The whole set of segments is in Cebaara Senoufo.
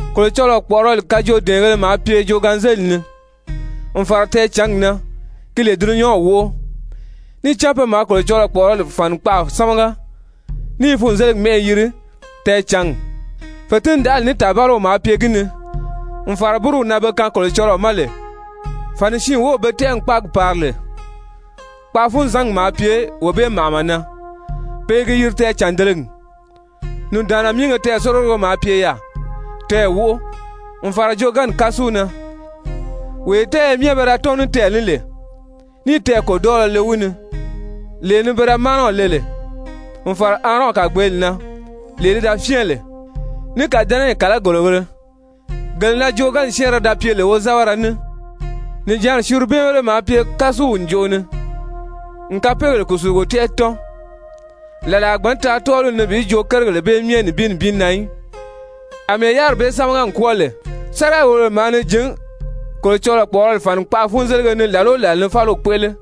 Kolocɔlɔɔ kpɔ̀ʔɔrɔli kajoodɛɛngēle maa pye joogaanzelili ni, n fàra tɛɛcǎngi na, gi lè dulunyanw wóʔo. Níì cán pe maa Kolocɔlɔɔ kpɔ̀ʔɔrɔli fànikpaʔa sámaga, ní i funzeligi mɛ́ʔɛ yiri Tɛɛcǎngi. Fètindaʔali ní tàbaliw maa pye gi ni, n fàra búruw na be kaan Kolocɔlɔɔ ma lè. Fàni siin wów be tɛ́ʔɛ n kpáagi pari lè, kpaafunzangi maa pye wee bee màʔama na, pe i gi yiri Tɛɛcàndelegi. Nùndaanna míige tɛɛ̀sorigogo maa pye yaà, tɛɛ̀ wóʔo, n fàra joogaanni kásu na, wee tɛ́ɛyɛ myɛ be da tɔ́n ní tɛɛ̀ ní lè, níì tɛɛ̀ kòdɔɔlɔ le wi ni, lee ni pe da mánɛw le lè n fàra Aarɔn kàgbeeli na, lee li da fyɛ́ɛn lè, ní kàdɛnɛyi kàlagorigēle, gele na joogaanni syɛ́ɛnrɛ da pye lè wozɛbɛrɛ ní. Nìjanri syerubɛnbéle maa pye kásuw ǹjoʔo ni n kapeegèle kùsulugo tɛ́ʔɛ tɔ́n. Làla a gbǎn taa tɔ́ɔliw ni bi joo kérigèle bee myɛ nibin nibin na í. Amɛɛ yáriri bee sámaga n kwɔ́ɔ lè, sáriga-wòlobèle maa ni jǐn Kolocɔlɔɔ kpɔ̀ʔɔrɔli fànikpaa-fúnzelige ni làla o làla ni fáliw kpéʔele.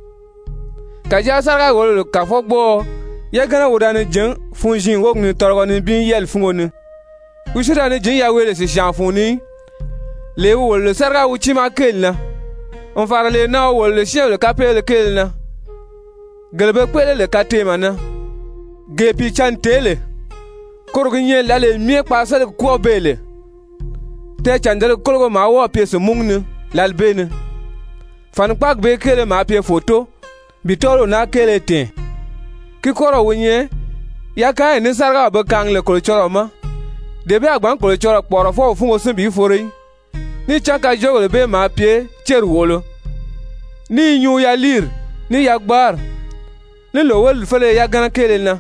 Kàjáa sáriga-wòlobèle kàfɔgbɔɔɔ yagana wi da ni jǐn funziin wógi ni tɔlɔgɔ nibin yɛ́ɛli fúngo ni, wi si da ni jǐn yaweele sìsyaan fun ni í, lee wi wòlo lè sáriga wi tiimaa kéeli na, n fàra lee na wi wòlo lè syɛ́ɛnbèle kapeegéle kéele na, gele be kpéʔele lè kateemɛ na. Gee Pìicǎnni tèé lè, koro gi nyɛ lǎlee myɛ kpaaseligi kwɔ́ɔ beè lè, tɛɛcàndelegi kólogo maa wɔ́ɔ̀ pye sìnmúgu ni lǎli bee ni. Fànikpaagi bee kéele maa pye fòto bi tɔ́ɔliw naa kéele tɛ̀ɛn. Ki kɔ́rɔw wi nyɛ yakaanyi ní sárigaw be kaangi lè Kolocɔlɔɔ ma, dee bee a gbǎn Kolocɔlɔɔ kpɔ̀ʔɔrɔfɔw fúngo sín bi foro í. Níì cán kajoogèle bee maa pye céri wòʔolo, ní i nyuu yaliiri, ní yagbaari, ní lòwelidi féleye yagana kéele na,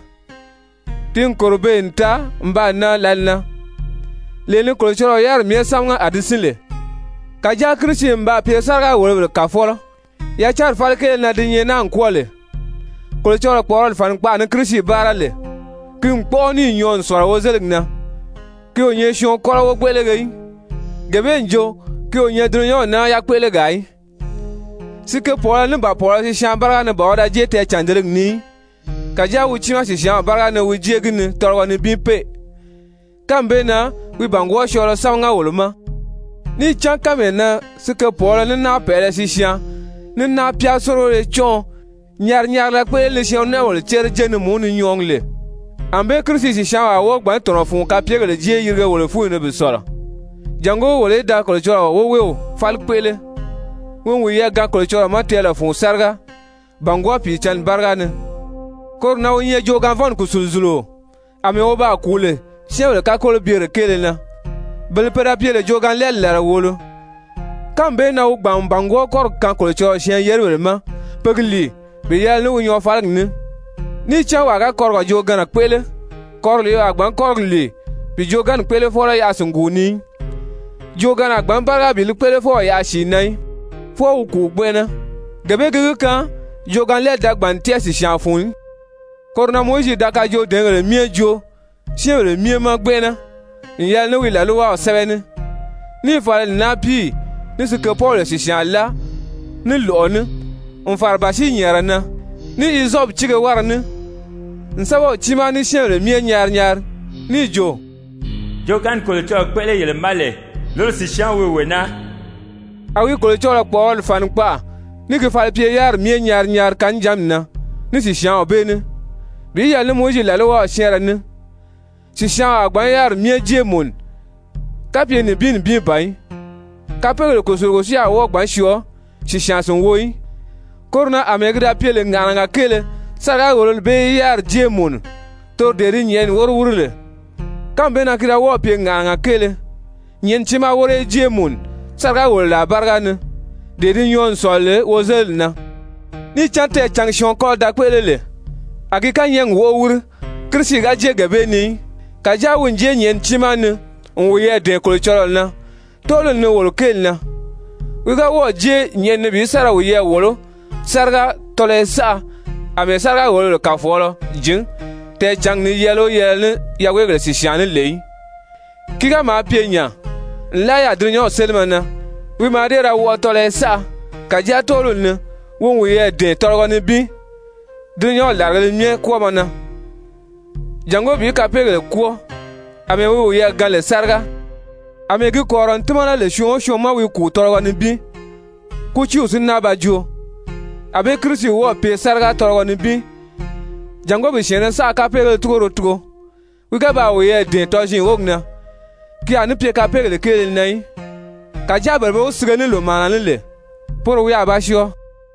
ti n kòro beè n taa n baa nan lǎli na, lee ni Kolocɔlɔɔ yáriri myɛ sámaga a di sín lè. Kàjáa Kirisi n baa pye sáriga-wòlobèle kàfɔlɔ yacanri fáli kéele na di nyɛ naa n kwɔ́ɔ lè. Kolocɔlɔɔ kpɔ̀ʔɔrɔli fànikpaʔa ni Kirisi báara lè, ki n kpɔ́ʔɔ níì nyɔɔ n sɔ̀lɔ wozeligi na, ki o nyɛ syɔɔn kɔ́lɔ wogbéʔelege í, gee bee n jo ki o nyɛ dulunyanw naa yakpéʔelegaa í. Sikepɔɔlɔ ní náapiiye sisyaan báriga ni ban wi da jée tɛɛcàndelegi ni í, kàjáa wi tiimaa sìsyaanw báriga ni wi jée gi ni tɔlɔgɔ nibin pée. Kánmi bee na wi bàngwɔɔ syɔɔlɔ sámaga wolo ma. Níì cán kánmee na sikepɔɔlɔ ní náapɛʔɛlɛ sisyaan, ní náapyaa-sórigoyo cɔ́nʔɔ nyari-nyarila kpéʔele ni syɛɛn-nɔ́nʔɔbèle cére jé ni mùú ni nyɔɔgi lè, ànbée Kirisi sìsyaanw a wɔ́ɔ gbǎn tɔ̀nɔ fun kapyegèle jée yirige wolo fúnyi ni bi sɔ̀lɔ, jàngó wolo í da Kolocɔlɔɔ woweew fáli kpéʔele, wi n wiyɛɛ gaan Kolocɔlɔɔ ma tɛɛlɛ fun sáriga, bàngwɔɔ Pìicǎnni báriga ni! Koro na wi nyɛ joogaanvɔnni kùsuluzuluo àmɛɛ wi baa kùu lè syɛ́ɛnbèle kakolobyere kéele na, bele pe da pye lè joogaanlɛɛli làla wòolo, kánmi bee na wi gbàn n bàngwɔɔ kɔ́rigi kaan Kolocɔlɔɔ syɛɛn-yeribèle ma pe gi lìi bi yɛlɛ ní wi nyɔɔfaligi ní. Níì cán wàa ga kɔrigɔ joogaanna kpéʔele, kɔriliibèle a gbǎn kɔ́rigi lìi bi joogaanni kpéʔelefɔlɔ yaʔa sìnguu ni í. Joogaanna a gbǎn báriga bi li kpéʔelefɔw yaʔa sìi na í, fwɔɔ wi kùu gbɛnʔɛnɛ. Gee bee gi gi kaan joogaanlɛɛli da gbàn n tɛ́ʔɛ sìsyaan fun í. Koro na Mowizi da kajoodɛɛngèle myɛ joo syɛ́ɛnbèle myɛ ma gbɛnʔɛnɛ n yɛlɛ ní wi làlwaw sɛ́bɛ ní, níì fala n náapiiyi ní sikepɔbèle sìsyaan láa ní lɔ̀ʔɔ ní n fàra bàsiinyɛɛnrɛ na, ní hizɔpi tíige wára ní, n sɛ́bɛw tiimaa, ní syɛ́ɛnbèle myɛ nyari nyari, níì jo: «Joogaanni Kolocɔlɔɔ kpéʔele yele ma lè, loro sìsyaanw wi wee naa.» A wi Kolocɔlɔɔ kpɔ̀ʔɔrɔli fànikpaʔa ní gi falipye-yáriri myɛ nyari nyari kannijanmi na ní sìsyaanw bee ní. Bi yɛlɛ ní Mowizi làlwaw syɛ́ɛnrɛ ní, sìsyaanw a gbǎn yáriri myɛ jée mùnu, kapye nibin nibin ban í. Kapeegèle kùsulugo si a wɔ́ɔ gbǎn syɔɔ sìsyaan sìnwo í. Koro na àmɛɛ ki da pye lè ŋàʔanaga kéele sáriga-wòlori bee í yáriri jée mùnu, toro dee di nyɛ̀ʔɛni wóro wíri lè, kánmi bee na ki da wɔ́ɔ̀ pye ŋàʔanaga kéele nyɛ̀ʔɛni tiimaa wóro í jée mùnu sáriga-wòloraa báriga ni, dee di nyɔɔ n sɔ̀lɔ lè wozeliri na. Níì cán tɛɛcǎngi syɔɔn kɔ́lɔ da kpéʔele lè, a gi kányɛɛgi wóʔo wíri, Kirisi ga jée gee bee ni í, kàjáa wi n jée nyɛ̀ʔɛni tiimaa ni n wiyɛɛ dɛ̀ɛn Kolocɔlɔɔ na tɔ́ɔliw ni wolo kéeli na. Wi ga wɔ́ɔ̀ jée nyɛ̀ʔɛni ni bi sa ra wiyɛɛ wòló sáriga tɔlɔyɔ saʔa àmɛɛ sáriga-wòlobèle kàfɔgbɔɔɔ jǐn tɛɛcǎngi ni yɛɛlɛ o yɛɛlɛ ní yaweegèle sìsyaan ní lè í. Ki ga maa pye nya, nlaa yaà dulunyanw sélimɛ na wi mǎà dée ra wɔʔɔ tɔlɔyɔ saʔa. Kàjáa tɔ́ɔliw ni wi n wiyɛɛ dɛ̀ɛn tɔlɔgɔ nibin dulunyanw làrigēle myɛ kwɔ́ɔmɔ na, jàngó bi kapeegèle kwɔ́ɔ, àmɛɛ wi wiyɛɛ gaan lè sáriga. Amɛɛ gi kɔ̀rirɔ n tímana lè syɔɔn o syɔɔn ma wi kùu tɔlɔgɔ nibin, kútiiw si náa ba joo, ànbée Kirisi wɔ́ɔ̀ pye sáriga tɔlɔgɔ nibin jàngó bi syɛ̀ɛnnɛ saʔa kapeegéle túgoro tugo, wi ga baa wiyɛɛ dɛ̀ɛn tɔziin wógi na, ki a ní pye kapeegèle kéele na í, kàjáa bele be wi sige ní lòmaana ní lè, poro wi a ba syɔɔ.